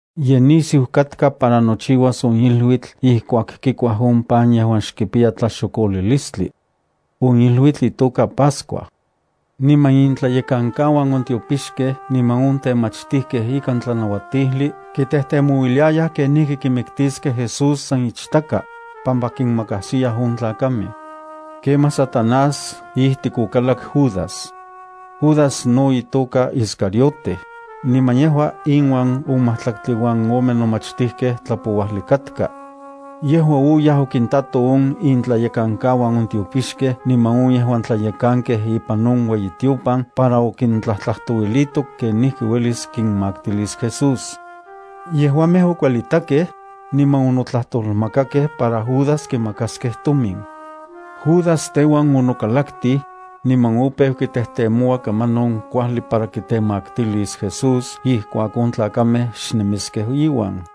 Ye nisiu katka para nochiuas on iluitl ijkuak kikuaj on pan yejuan xkipiya tlaxokolilistli. On iluitl itoka Pascua. Niman intlayekankauan on tiopixkej niman on temachtijkej ikan tlanauatijli kitejtemouiliayaj kenijki kimiktiskej Jesús, san ichtaka, pampa kinmakajsiyaj on tlakamej. Kemaj Satanás ijtik okalak Judas. Judas no itoka Iscariote, niman yejua inuan on majtlaktli uan ome nomachtijkej tlapouajli katka. Yejua oyaj okintato on intlayekankauan on tiopixkej niman on yejuan tlayekankej ipan on ueyitiopan para okintlajtlajtouilito kenijki uelis kinmaktilis Jesús. Yejuamej okuelitakej, niman onotlajtolmakakej para Judas kimakaskej tomin. Judas teuan onokalaktij, niman opeu kitejtemoua kamanon kuajli para kitemaktilis Jesús ijkuak on tlakamej xnemiskej iuan.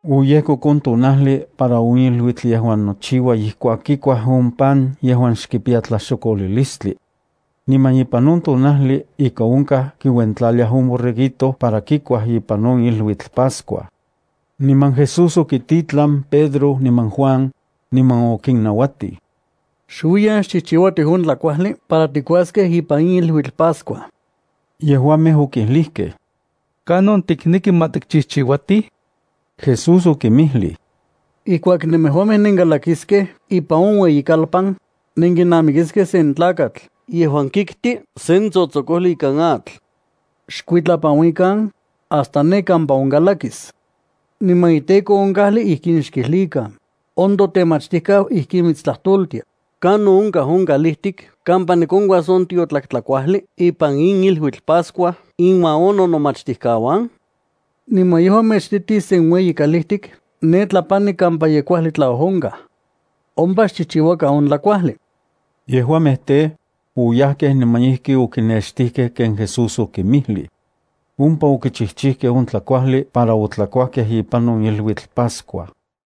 Oyejkok on tonajli para on iluitl yejuan nochiua ijkuak kikuaj on pan yejuan xkipiya tlaxokolilistli. Niman ipan on tonajli ika onkaj kiuentlaliaj on borreguito para kikuaj ipan on iluitl Pascua. Niman Jesús okititlan Pedro niman Juan, niman okinnauatij: —Xuiyan, xchijchiuatij on tlakuajli para tikuaskej ipan in iluitl Pascua. Yejuamej okijlijkej: —¿Kanon tikneki ma tikchijchiuatij? Jesús okinmijlij: —Ijkuak nemejuamej nenkalakiskej ipan on ueyikalpan, nenkinamikiskej sen tlakatl yejuan kikti sen tsotsokojli ikan atl. Xkuitlapanuikan, hasta ne kampa onkalakis, niman iteko on kajli ijkin xkijlikan: “On toTemachtijkau ijkin mitstlajtoltia: ¿Kanon onkaj on kalijtik kampa nikonkuas on tiotlak tlakuajli ipan in iluitl Pascua inuan on nonomachtijkauan?” Niman yejua mechititis sen ueyi kalijtik ne tlapani kampa ye kuajli tlaojonkaj. Ompa xchijchiuakan on tlakuajli. Yejuamej tej, oyajkej niman ijki okinextijkej ken Jesús okinmijlij. Ompa okichijchijkej on tlakuajli para otlakuajkej ipan on iluitl Pascua.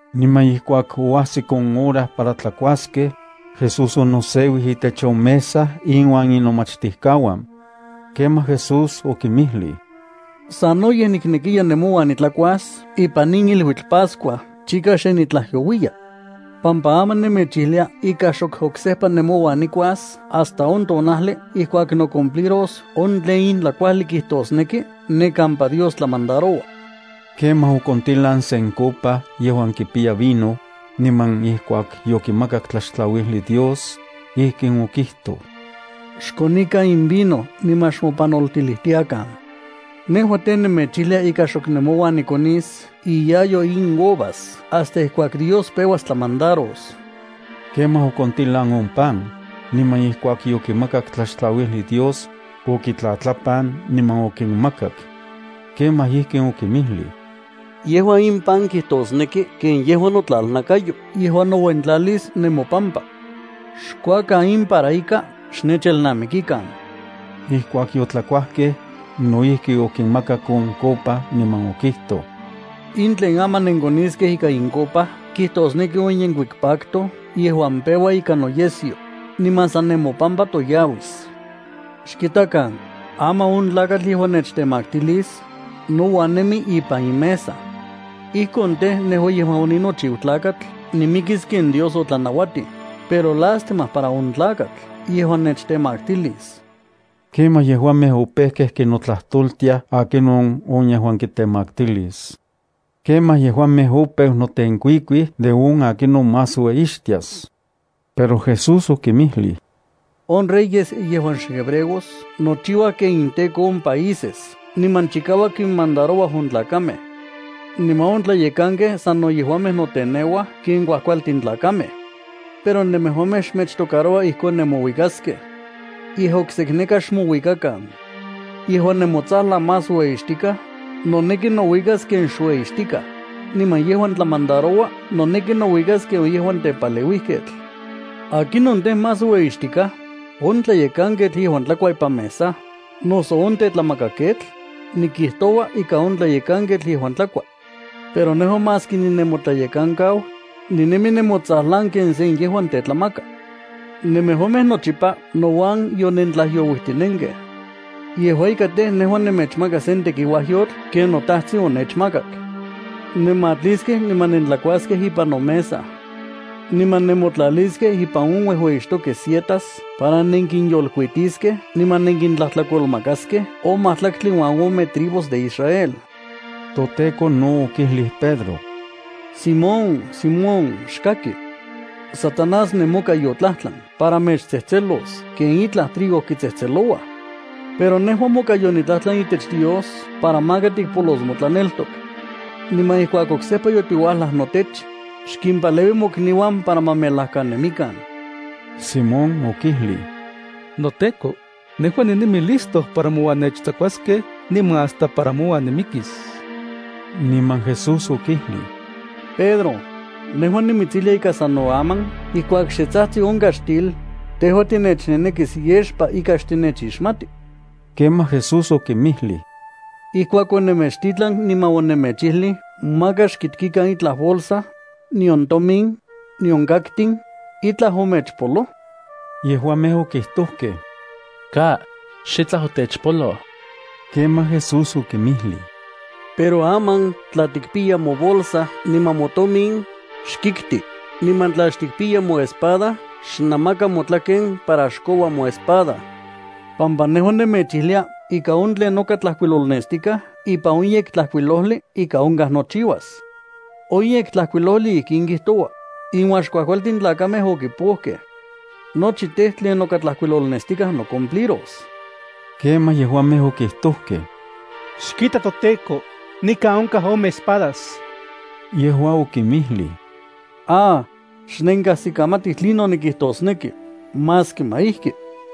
Niman ijkuak oajsik on hora para tlakuaskej, Jesús onoseuij itech on mesa inuan inomachtijkauan. Kemaj Jesús okinmijlij: —¡Sanoyej niknekiya nemouan nitlakuas ipan in iluitl pascua, chika xe nitlajyouiya! Pampa aman nemechijlia ika xok oksejpa nemouan nikuas hasta on tonajli ijkuak nocumpliros on tlen in tlakuajli kijtosneki ne kampa Dios tlamandaroua. Kemaj okontilan sen copa yejuan kipiya vino, niman ijkuak yokimakak tlaxtlauijli Dios, ijkin okijtoj: —Xkonikan in vino niman xmopanoltilijtiakan. Nejua tej, nemechijlia ika xok nemouan nikonis iyayo in uvas hasta ijkuak Dios peuas tlamandaros. Kemaj okontilan on pan, niman ijkuak yokimakak tlaxtlauijli Dios, okitlatlapan niman okinmakak. Kemaj ijkin okinmijlij: —Yejua in pan kijtosneki ken yejua notlalnakayo yejuan nouentlalis nemopampa. Xkuakan in para ika xnechelnamikikan. Ijkuak yotlakuajkej, no ijki okinmakak on copa niman okijtoj: —In tlen aman nenkoniskej ika in copa kijtosneki on yenkuik pacto yejuan peua ikan noyesyo, niman san nemopampa toyauis. ’Xkitakan, aman on tlakatl yejuan nechtemaktilis, nouan nemi ipan in mesa. Ijkon tej, nejua yejuan oninochiu Tlakatl nimikis ken Dios otlanauatij, pero ¡lástima para on tlakatl yejuan nechtemaktilis! Kemaj yejuamej opejkej kinotlajtoltiaj akinon on yejuan kitemaktilis. Kemaj yejuamej opeu notenkuikuij de on akinon más ueyixtias. Pero Jesús okinmijlij: —On reyes yejuan xhebreos nochiuaj ken inteko on países niman chikauak kinmandarouaj on tlakamej. Niman on tlayekankej sano yejuamej noteneuaj ken kuajkualtin tlakamej. Pero nemejuamej xmechtocaroua ijkon nemouikaskej. Yej okseneka xmouikakan. Yejuan nemotsajlan más ueyixtikaj noneki nouikas ken xueyixtikaj, niman yejuan tlamandaroua noneki nouikas ken on yejuan tepaleuijketl. ¿Akinon tej, más ueyixtikaj, on tlayekanketl yejuan tlakua ipan mesa, noso on tetlamakaketl? Nikijtoua ika on tlayekanketl yejuan tlakua. Pero nejua, maski ninemotlayekankau, ninemi nemotsajlan ken se yejuan tetlamaka. ’Nemejuamej nochipa nouan yonentlajyouijtinenkej. Yejua ika tej, nejua nemechmaka sen tekiuajyotl ken noTajtsin onechmakak. Nenmatliskej niman nentlakuaskej ipan nomesa. Niman nemotlaliskej ipan on uejueyixtokej sietas para nenkinyolkuitiskej niman nenkintlajtlakolmakaskej on majtlaktli uan ome tribus de Israel. ToTEKO no okijlij Pedro: —Simón, Simón, xkaki. Satanás nemoka yotlajtlan para mechtsejtselos ken itlaj trigo kitsejtselouaj, pero nejua moka yonitlajtlan itech Dios para maka tikpolos motlaneltok. Niman ijkuak oksejpa yotiuajlaj notech, xkimpaleui mokniuan para ma melajkanemikan. Simón okijlij: —NoTEKO, nejua ninemi listo para mouan nechtsakuaskej niman hasta para mouan nimikis. Niman Jesús okijlij: —Pedro, nejua nimitsijlia ika sano aman ijkuak xe tsajtsi on kaxtil, tejua tinechnenekis yexpa ika xtinechixmati. Kemaj Jesús okinmijlij: —Ijkuak onemechtitlan niman onemechijlij maka xkitkikan itlaj bolsa, nion tomin, nion kaktin, ¿itlaj omechpoloj? Yejuamej okijtojkej: —Ka, xitlaj otechpoloj. Kemaj Jesús okinmijlij: —Pero aman tla tikpiya mobolsa niman motomin, xkikti, niman tla xtikpiya moespada xnamaka motlaken para xkoua moespada. Pampa nejua nemechijlia ika on tlen noka tlajkuilolnestikaj ipan on Yektlajkuilojli ika onkaj nochiuas. On Yektlajkuilojli ijkin kijtoua: “Inuan xkuajkualtin tlakamej okipojkej.” Nochi tej, tlen noka tlajkuilolnestikaj nocumpliros. Kemaj, yejuamej okijtojkej: —Xkita toTEKO, nikan onkaj ome espadas. Yejua okinmijlij: —¡Ah, xnenkajsikamatij tlinon nikijtosneki! Maski ma ijki.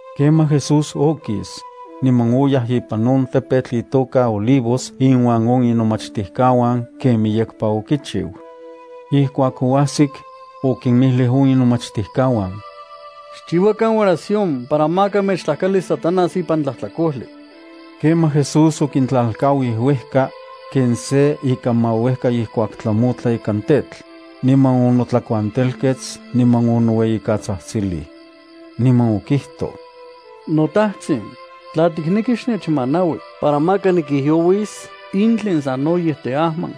Kemaj Jesús okis, niman oyaj ipan on tepetl itoka Olivos inuan on inomachtijkauan ken miyekpa okichiu. Ijkuak oajsik, okinmijlij on inomachtijkauan: —Xchiuakan oración para maka mechtlajkalis Satanás ipan tlajtlakojli. Kemaj Jesús okintlalkauij uejka ken se ika mauejka ijkuak tlamotla ikan tetl, niman onotlakuantelkets niman onoueyikatsajtsilij. Niman okijtoj: —NoTajtsin, tla tikneki, xnechmanaui para maka nikijyouis in tlen sanoyej teajman.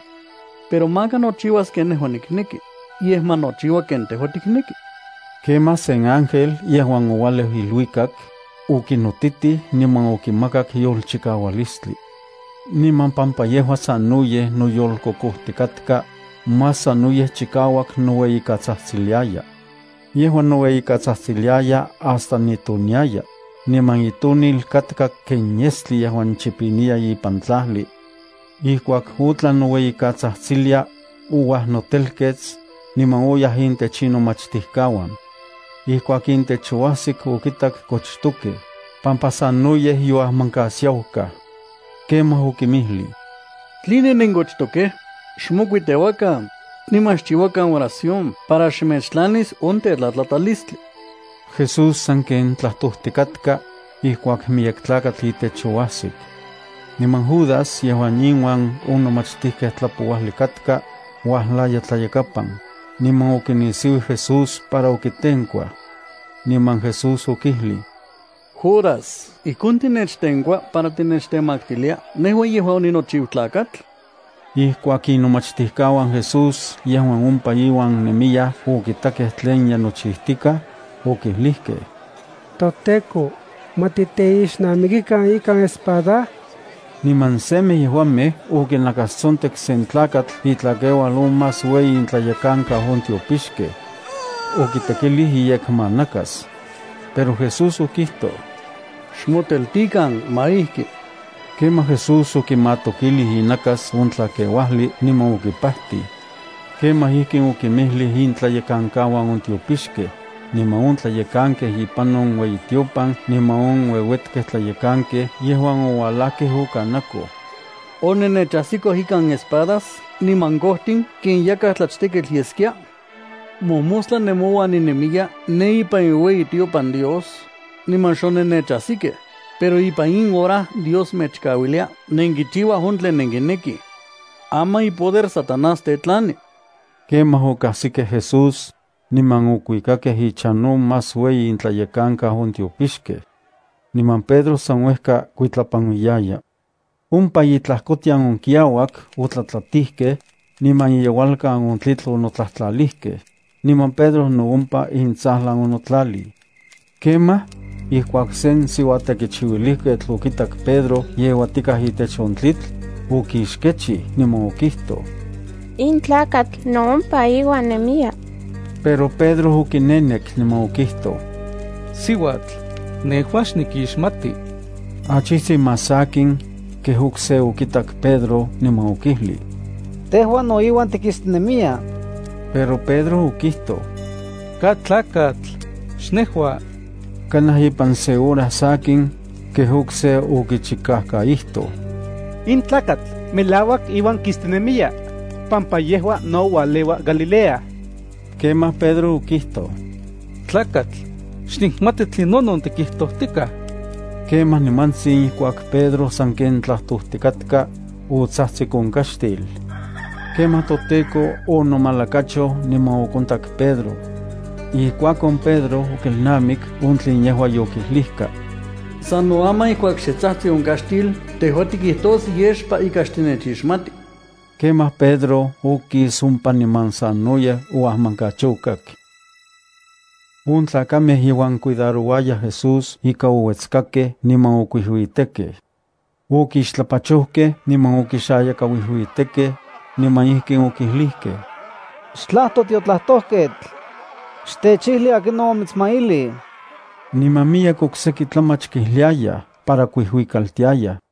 Pero maka nochiuas ken nejua nikneki, yej ma nochiua ken tejua tikneki. Kemaj sen ángel yejuan oualeu iluikak, okinotitij niman okimakak yolchikaualistli. Niman pampa yejua sanoyej noyolkokojtikatka, más sanoyej chikauak noueyikatsajtsiliaya. Yejua noueyikatsajtsiliaya hasta nitoniaya, niman itonil katka ken yestli yejuan chipiniya ipan tlajli. Ijkuak otlan noueyikatsajtsilia, ouajnotelkets, niman oyaj intech inomachtijkauan. Ijkuak intech oajsik, okintak kochtokej, pampa sanoyej yoajmankasiaukaj. Kemaj okimijlij: —¿Tline nenkochtokej? Xmokuiteuakan, niman xchiuakan oración para xmechtlanis on tetlatlatalistli. Jesús sanken tlajtojtikatka, ijkuak miyek tlakatl itech oajsik. Niman Judas yejuan inuan on nomachtijkej tlapouajli katka, uajlaya tlayakapan, niman okinisiuij Jesús para okitenkuaj. Niman Jesús okijlij: —Judas, ¿ijkon tinechtenkua para tinechtemaktilia nejua yejuan oninochiu Tlakatl? Ijkuak inomachtijkauan Jesús yejuan ompa iuan nemiyaj okitakej tlen ye nochijtikaj, okijlijkej: —ToTEKO, ¿ma titeixnamikikan ikan espada? Niman semej yejuamej okinakastsontek sen tlakatl itlakeual on más ueyi intlayekankau on tiopixkej. Okitekilij iyekmanakas. Pero Jesús okijtoj: —Xmoteltikan. Ma ijki. Kemaj Jesús okimatokilij inakas on tlakeuajli niman okipajtij. Kemaj ijkin okinmijlij intlayekankauan on tiopixkej, niman on tlayekankej ipan on ueyitiopan niman on ueuetkej tlayekankej yejuan oualajkej okanakoj: —¿Onennechajsikoj ikan espadas niman kojtin ken yakaj nitlachteketl yeskia? Mojmostla nemouan ninemiya ne ipan iueyitiopan Dios, niman xonennechajsikej, pero ipan in hora Dios mechkauilia nenkichiuaj on tlen nenkinekij. Aman ipoder Satanás tetlani. Kemaj okajsikej Jesús, niman okuikakej ichan on más ueyi intlayekankau on tiopixkej. Niman Pedro san uejka kuitlapanuijtiaya. Ompa itlajkotian on kiauak otlatlatijkej, niman iyeualkan on tlitl onotlajtlalijkej, niman Pedro no ompa intsajlan onotlalij. Kemaj ijkuak sen siuatekichiuilijketl okitak Pedro yeuatikaj itech on tlitl, okixkechij niman okijtoj: —In tlakatl no ompa iuan nemiya. Pero Pedro okinenek niman okijtoj: —Siuatl, nejua xnikixmati. Achijtsin más sakin, kej okse okitak Pedro niman okijlij: —Tejua no inuan tikistinemiya. Pero Pedro okijtoj: —Ka tlakatl, xnejua. Kanaj ipan se hora sakin, kej okse okichikajkaijtoj: —In tlakatl melauak iuan kistinemiya, pampa yejua no ualeua Galilea. Kemaj Pedro okijtoj: —Tlakatl, xnikmati tlinonon tikijtojtikaj. Kemaj nimantsin ijkuak Pedro sanken tlajtojtikatka, otsajtsik on kaxtil. Kemaj toTEKO onomalakachoj niman okontak Pedro. Ijkuakon Pedro okelnamik on tlen yejua yokijlijka: “Sano aman ijkuak xe tsajtsi on kaxtil tejua tikijtos yexpa ika xtinechixmati.” Kemaj Pedro okis ompa niman sanoyej oajmankachokak. On tlakamej yejuan cuidarouayaj Jesús ika ouetskakej niman okuijuitekej. Okixtlapachojkej niman okixayakauijuitekej, niman ijkin okijlijkej: —Xtlajto tiotlajtojketl. Xtechijli akinon omitsmailij. Niman miyek okseki tlamach kijliayaj para kuijuikaltiayaj.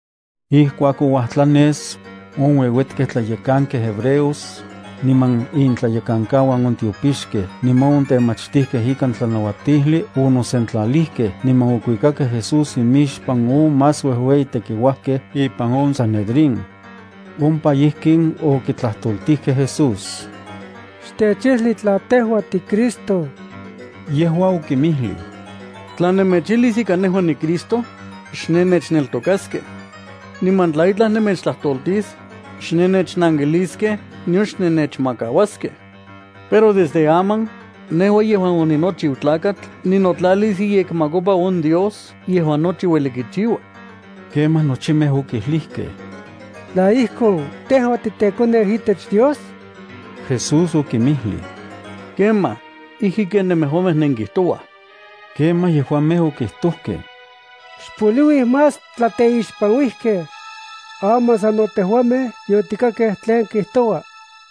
Ijkuak ouajtlanes, on ueuetkej tlayekankej hebreos, niman intlayekankauan on tiopixkej niman on temachtijkej ikan tlanauatijli onosentlalijkej niman okuikakej Jesús imixpan on más uejueyi tekiuajkej ipan on Sanedrín. Ompa ijkin okitlajtoltijkej Jesús: —Xtechijli tla tejua tiCristo. Yejua okinmijlij: —Tla nemechijlis ika nejua niCristo, xnennechneltokaskej. Niman tla itlaj nemechtlajtoltis, xnennechnankiliskej nion xnennechmakauaskej. Pero desde aman nejua yejuan oninochiu Tlakatl ninotlalis iyekmakopa on Dios yejuan nochi ueli kichiua. Kemaj nochimej okijlijkej: —¿Tla ijkon, tejua titeKoneu itech Dios? Jesús okinmijlij: —Kemaj. Ijki ken nemejuamej nenkijtouaj. Kemaj yejuamej okijtojkej: —Xpoliuij más tlateixpanuijkej. Aman sano tejuamej yotikakej tlen kijtoua.